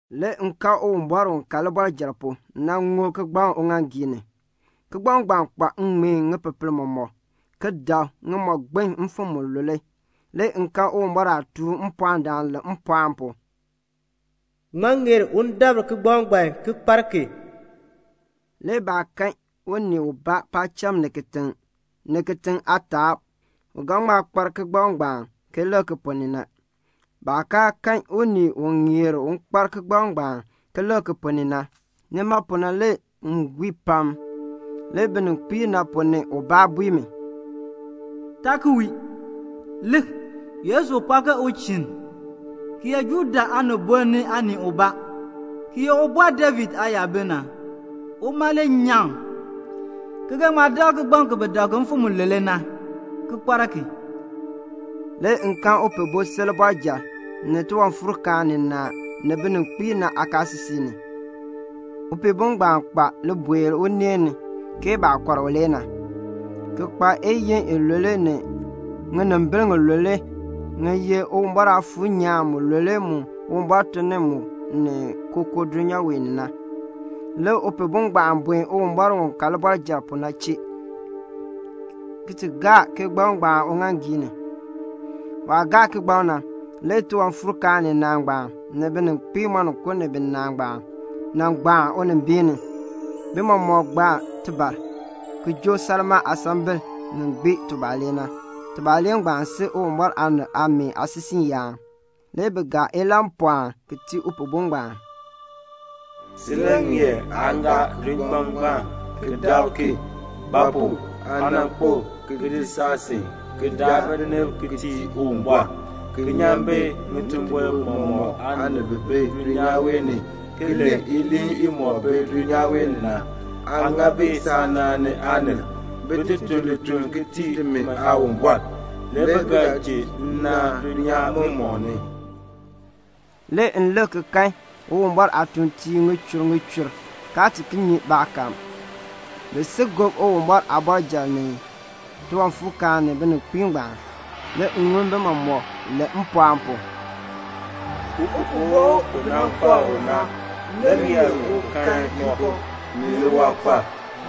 Le m kan Uwumbɔr u ka libɔrjal pu na ŋub kigbaŋ uŋaaŋgii ni. Kigbaŋ ngbaan kpa ŋŋmeen ŋipepel mɔmɔk, ki dab ŋimɔgbiln mfim mulule. Le m kan Uwumbɔr aatuun mpɔɔndaan len mpɔɔn pu, "Ŋmaa ŋeer un dabr kigbaŋ ngbaan ki kpar ki?" Le baa kan unii ubaa paacham ni kitiŋ, ni kitiŋ aataab, u ga ŋma kpar kigbaŋ ngbaan ki lik ki ponn ni na. Baah kaa kan unii u ŋeer un kpar kigbaŋ ngbaan ki lik ki ponn ni na, nima pu na le m wii pam. Le bininkpiib ponn ni ubaa bui mi, "Taa ki wii. Lik, Yesu u pɔɔ ke uchinn, ki ye Juda aanibol aanii ubaa, ki ye Ubɔr David aayabil na, uma le nyaŋ, ki ga ŋma dabr kigbaŋ ki bi dab ki mfim mulule na, ki kpar ki." Le m kan Upihbo si libɔrjal, ni tiwanfuurkaan ninaa, ni bininkpiib aakaasisik ni. Upihbo ngbaan kpa libuel uneen ni ke baah kɔr u le na, ki kpa iyiin ilule ni ŋinimbil ŋilule ŋi ye Uwumbɔr Aafuur nyaan mulule mu Uwumbɔr tun ni mu ni kookoo dulnyaa wee ni na. Le Upihbo ngbaan buen Uwumbɔr u ka libɔrjal pu na chee, ki ti gaa kigbaŋ ngbaan uŋaaŋgii ni. Waah gaa kigbaŋ na, le tiwanfuurkaan ninaa ngbaan, ni bininkpiib moninko ni binaa ngbaan, nan gbaan unimbiin ni. Bi mɔmɔk gbaa tibar, ki joo salmaa aasambil ŋi gbii tubalee na. Tubalee ngbaan si Uwumbɔr aanib aameen aasisiiyaan. Le bi gaa ilahnpɔɔn ki tii Upihbo ngbaan: "Si le ŋeer aa gaa kigbaŋ ngbaan ki dabr ki; ba pu? aa nan kpo ki di saasin ki daa binib ki tii Uwumbɔr; ki nyan bi ŋitimbol mɔmɔk aanib bi bi dulnyaa wee ni ki len iliin imɔk bi dulnyaa wee ni na, Aa ŋa bi saanaan ni aanib, bin ti tun lituln ki tii timi Aawumbɔr, le bi ga ji nnaan dulnyaa mɔmɔk ni." Le m lik ki kan Uwumbɔr aatuuntiib ŋichur ŋichur, kaa ti nyi baakahm. Bi si gob Uwumbɔr aabɔrjal ni tiwanfuurkaan ni bininkpiib ngbaan. Le m ŋun bi mɔmɔk len mpɔɔn pu: "Upihbo u bi nan kɔr u na le ŋeer un kan yiko, ni liwankpal,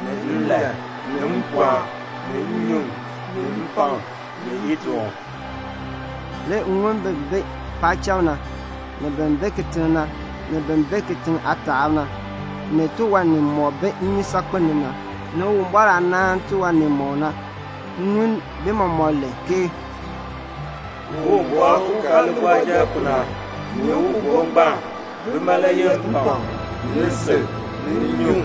ni nlan, ni mpɔɔn, ni nnyuŋ, ni mpakm, ni idoon." Le m ŋun bin bi paacham na, ni bin bi kitiŋ na, ni bin bi kitiŋ aataab na, ni tiwan nimɔk bi nnyusaakpem ni na, ni Uwumbɔr aah naan tiwan nimɔk na, m ŋun bi mɔmɔk len ke "Uwumbɔr u ka libɔrjal pu na, ni Upihbo ngbaan, bima le yeh mpakm, ni lisil, ni nnyuŋ,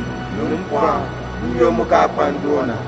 ni mpɔɔn, n-yoonn mu kaa kpa ndoon na."